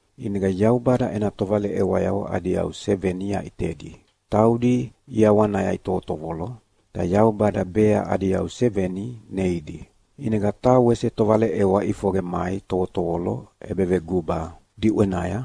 ʼInega Yaubada ena tovaleʼewayavo adi yau seveni yaʼitedi, taudi ʼiawanaya itovotovolo, ta Yaubada bea adi yau seveni neidi. ʼInega taha wese tovaleʼewa ʼifoqe mai tovotovolo ʼebeveguba diʼwenaya,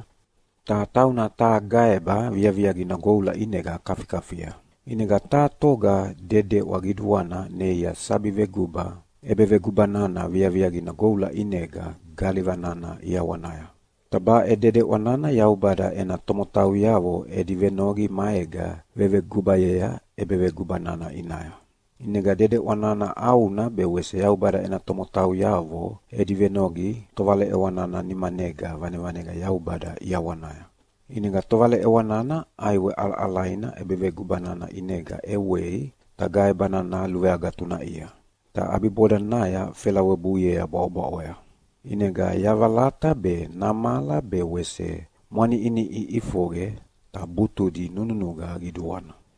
ta tauna taha gaeba viaviaqina goula ʼinega kafikafia. ʼInega taha toga dedeʼwa qiduana neia sabi veguba ʼebeveguba nana viaviaqina goula ʼinega galiva nana ʼiawanaya. Ta baʼe dedeʼwa nana Yaubada ena tomotauyavo edi venoqi maega vevegubayea ʼebeveguba nana ʼinaya. ʼInega dedeʼwa nana ʼauna be wese Yaubada ena tomotauyavo edi venoqi tovaleʼewa nana nimanega vanevane Yaubada ʼiawanaya. ʼInega tovaleʼewa nana ʼaiwe ʼalaʼalaina ʼebeveguba nana ʼinega ʼewei ta gaeba nana luveagatunaʼia, ta ʼabibodanaya felawebuiea bwaʼobwaʼoya. ʼInega yavalata be, namala be wese mwaniʼiniʼi ʼifoqe, ta butudi nunuqa qiduana.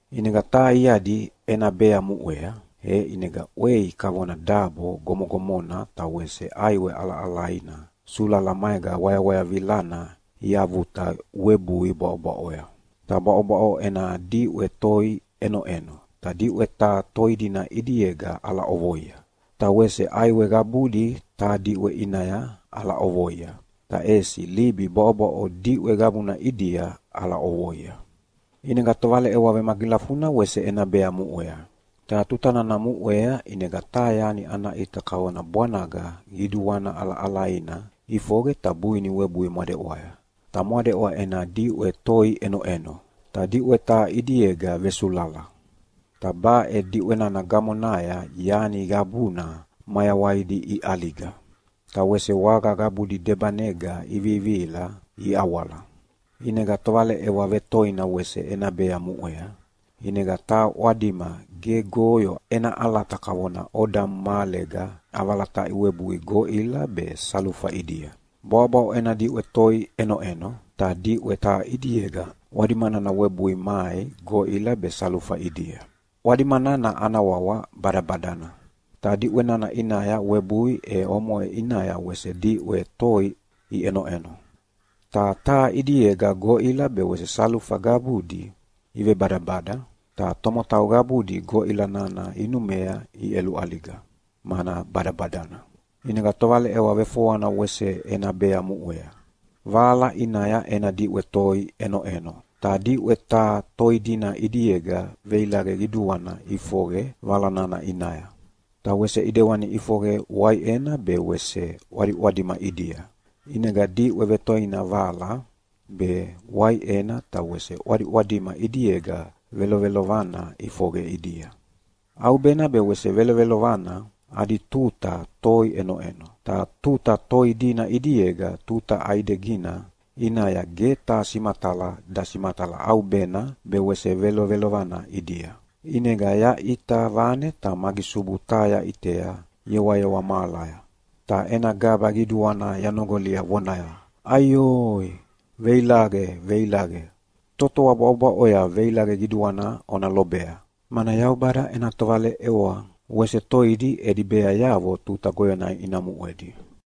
ʼInega taha iadi ena bea muʼea, e ʼinega ʼwei kavona dabo gomogomona ta wese ʼaiwe ʼalaʼalaina sulala maega wayawayavilana iavuta webui bwaʼobwaʼoya. Ta bwaʼobwaʼo ena diʼwe toi ʼenoʼeno, ta diʼwe taha toi dina ʼidiega ʼalaʼovoia, ta wese ʼaiwe qabudi taha diʼwe ʼinaya ʼalaʼovoia, ta ʼesi libi bwaʼobwaʼo diʼwe qabuna ʼidia ʼalaʼovoia. ʼInega tovaleʼewa vemagilafuna wese ena bea muʼea. Ta tuta nana muʼea ʼinega taha yani ana ʼita kavona bwanaga qiduana ʼalaʼalaina ʼifoqe ta buini webui mwadeʼwaya. Ta mwadeʼwa ena diʼwe toi ʼenoʼeno, ta diʼwe taha ʼidiega vesulala. Ta baʼe diʼwe nana gamonaya yani qabuna mayawaidi iʼaliga, ta wese waga qabudi debanega ivivihila iawala. ʼInega tovaleʼewa vetoina wese ena bea muʼea, ʼinega taha ʼwadima gegoyo ena ʼalata kavona odamu mahalega ʼavalataʼi webui goʼila be salufa ʼidia. Bwaʼobwaʼo ena diʼwe toi ʼenoʼeno, ta diʼwe taha ʼidiega ʼwadima nana webui mai goʼila be salufa ʼidia. ʼWadima nana ana wawa Badabadana. Ta diʼwe nana ʼinaya webui e omoʼe ʼinaya wese diʼwe toi iʼenoʼeno. Ta taha ʼidiega goʼila be wese salufa qabudi ivebadabada, ta tomotau qabudi goʼila nana inumea iʼeluʼaliga, mana badabadana. ʼInega tovaleʼewa vefoana wese ena bea muʼea. Vala ʼinaya ena diʼwe toi ʼenoʼeno, ta diʼwe taha toi dina ʼidiega veilaqe qiduana ʼifoqe vala nana ʼinaya. Ta wese ʼidewani ʼifoqe waiʼena be ʼwadiʼwadima ʼidia. ʼInega diʼwe vetoina vala, be waiʼena ta wese ʼwadiʼwadima ʼidiega velovelovana ʼifoqe ʼidia. ʼAubena be wese velovelovana adi tuta toi ʼenoʼeno, ta tuta toi dina ʼidiega tuta ʼaidegina ʼinaya ge taha simatala dasimatala ʼaubena be wese velovelovana ʼidia. ʼInega yaʼita vane ta magisubu taha yaʼitea yewayewa mahalaya, ta ena gaba qiduana yanoqolia vonaya, “Aioi, veilaqe, veilaqe! Totoa bwaʼobwaʼoya veilaqe qiduana ona lobea, mana Yaubada ena tovaleʼewa wese toidi edi beayavo tuta goyona ina muʼedi.”